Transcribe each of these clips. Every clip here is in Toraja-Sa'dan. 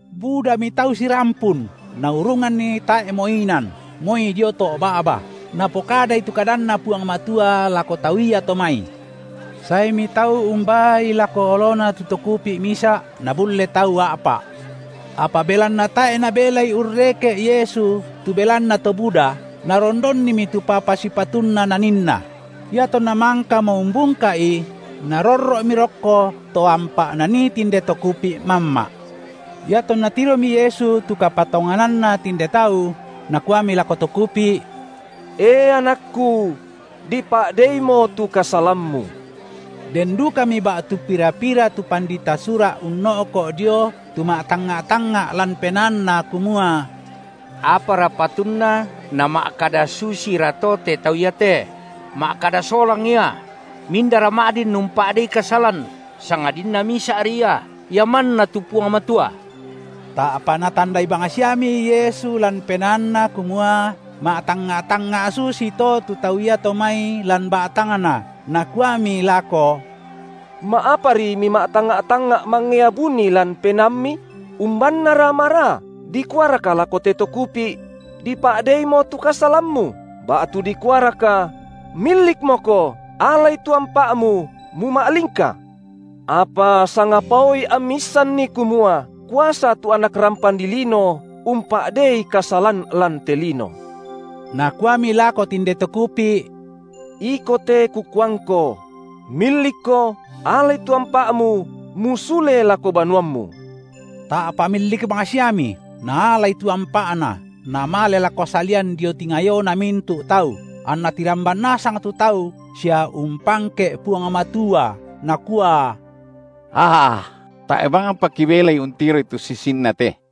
Budami tau sirampun, naurunganni tae’mo inan, moi dio to’ ba’ba, Napokadai tu kadanNa Puang Matua lako tau iato mai. Saemi tau umbaai lako oloNa tu to kupi’ misa’, nabulle tau a’pa’. Apa belanna tae’ nabelai urreke’ Yesu tu belanna to buda, narondonnimi tu papa sipatunna naninNa; iatonna mangkamo umbungka’i, narorro’mi rokko to ampa’ nanii tinde to kupi’ mamma’. Iatonna tiromi Yesu tu kapatongananna tinde tau, Nakuami lako to kupi’: E anakku! dipa’deimo tu kasalammu. Den dukami ba’tu pira-pira tu pandita Sura’ unno’ko’ dio tu ma’tangnga’-tangnga’ lan penaanna kumua: Apara patunna nama’kada susirato te tau iate? Ma’kada solang Ia! mindara ma’din umpa’dei kasalan, sangadinna Misa’ri ia, Ia manna tu Puang Matua. Ta’pa Natandai bangsiami Yesu lan penaanNa kumua ma’tangnga’-tangnga’ susito tu tau iato mai lan ba’tangna, Nakuami lako: Ma’apari mima’tangnga’-tangnga’ mangea buni lan penaammi? Umbannara maraa: dikuaraka lako te to kupi’: Dipa’deimo tu kasalammu, ba’tu dikuaraka: Millikmoko, alai tu ampa’mu, muma’lingka? Apa sangapaoi ammi issanni kumua kuasa tu Anak rampan dilino umpa’dei kasalan lan te lino –, Nakuami lako tinde to kupi’: Iko te Kukuangko: millikko, alai tu ampa’mu, musule lako banuammu! Ta’pa millik bangsiami, naalai tu ampa’na, namale lako salian dio tingayona mintu’ tau, anna tiramban nasang tu tau sia umpangke’ Puang Matua, nakua: Aa, tae’ bangpa kibelai untiroi tu susinna te!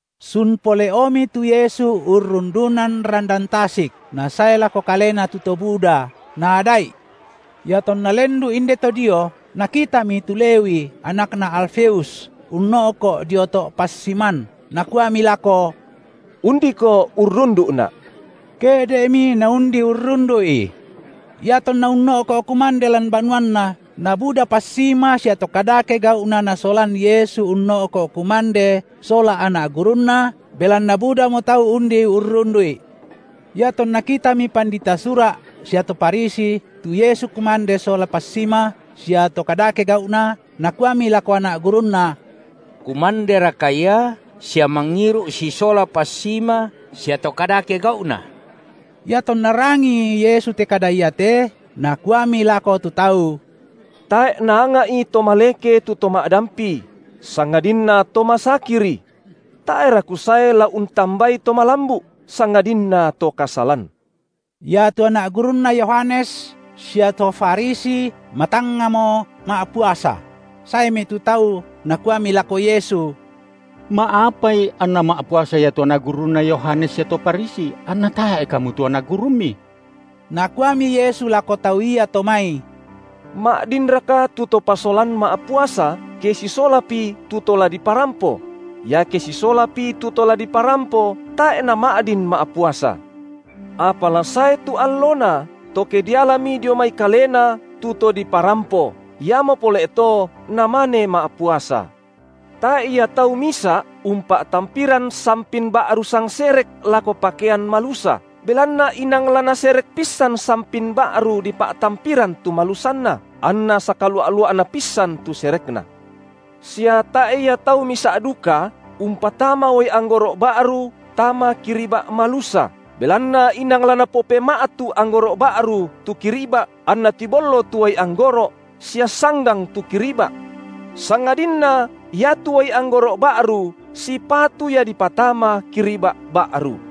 Sun pole’omi tu Yesu urrundunan randan tasik, na sae lako Kalena tu to buda, Naada’i. Iatonna lendu’ indeto dio, Nakitami tu Lewi, anakna Alfeus, unno’ko’ dio to’ passiman, Nakuami lako: Undiko urrundu’Na’. Ke’de’mi naundi urrundu’I. Iatonna unno’ko’ kumande lan banuanna nabuda passima sia to kadake gau’na Nasolan Yesu unno’ko’ kumande sola anak gurunNa, belanna budamo tau undi urrundu’I. Iatonna kitami pandita Sura’ sia to Farisi tu Yesu kumande sola passima sia to kadake gau’na, nakuami lako anak gurunNa: Kumanderaka Ia sia mangiru’ sisola passima sia to kadake gau’na? Iatonna rangii Yesu te kada iate, Nakuami lako tu tau: Tae’ naanga’i to maleke tu to ma’dampi, sangadinna to masakiri. Tae’ra Kusae la untambai to malambu’, sangadinna to kasalan. Iatu anak gurunNa Yohanes sia to Farisi matangngamo ma’puasa; saemi tu tau nakuami lako Yesu: Ma’apai anna ma’puasa ia tu anak gurunna Yohanes sia to Farisi, anna tae’ Kamu tu anak gurumMi? Nakuami Yesu lako tau iato mai: Ma’dinraka tu to pasolan ma’puasa ke sisolapi tu to la diparampo? Iake sisolapi tu to la diparampo, tae’ nama’din ma’puasa. Apa la sae tu allona, to ke dialami dio mai kalena tu to diparampo, iamo pole’ to namane ma’puasa. Tae’ ia tau misa’ umpa’tampiran sampin ba’ru sangserek lako pakean malusa, belanna inang la naserek pissan sampin ba’ru dipa’tampiran tu malusanna, anna sakalua’-lua’na pissan tu serekna. Sia tae’ ia tau misa’ duka umpatama uai anggoro’ ba’ru tama kiriba’ malusa, belanna inang la napopema’tu anggoro’ ba’ru tu kiriba’ anna tibollo tu uai anggoro’ sia sanggang tu kiriba’. Sangadinna iatu uai anggoro’ ba’ru sipatu ia dipatama kiriba’ ba’ru.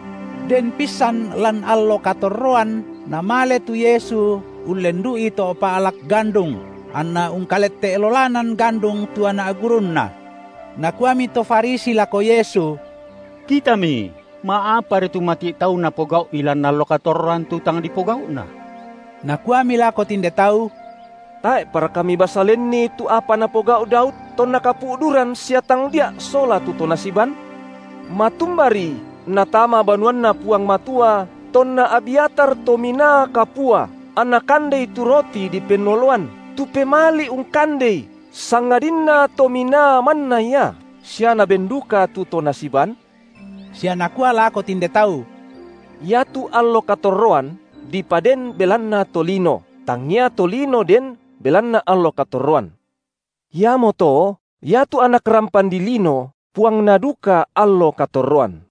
Den pissan lan allo katorroan Namale tu Yesu ullendu’i to’ pa’lak gandung, anna ungkalette’ lolanan gandung tu anak gurunNa. Nakuami to Farisi lako Yesu: Kitami, ma’apari tu mati’ tau napogau’i lan allo katorroan tu tang dipogau’na. Nakuami lako tinde tau: Tae’paraka mibasa lenni tu apa napogau’ Daud tonna kapu’duran sia tangdia’ sola tu to nasiban? Matumbari natama banuanNa Puang Matua tonna Abyatar Tominaa Kapua anna kandei tu roti dipennoloan, tu pemali ungkandei sangadinna to minaa manna ia, sia naben duka tu to nasiban? Sia Nakua lako tinde tau: Iatu allo katorroan dipaden belanna tolino, tangia tolino den belanna allo katorroan. Iamoto iatu Anak rampan dilino Puangna duka allo katorroan.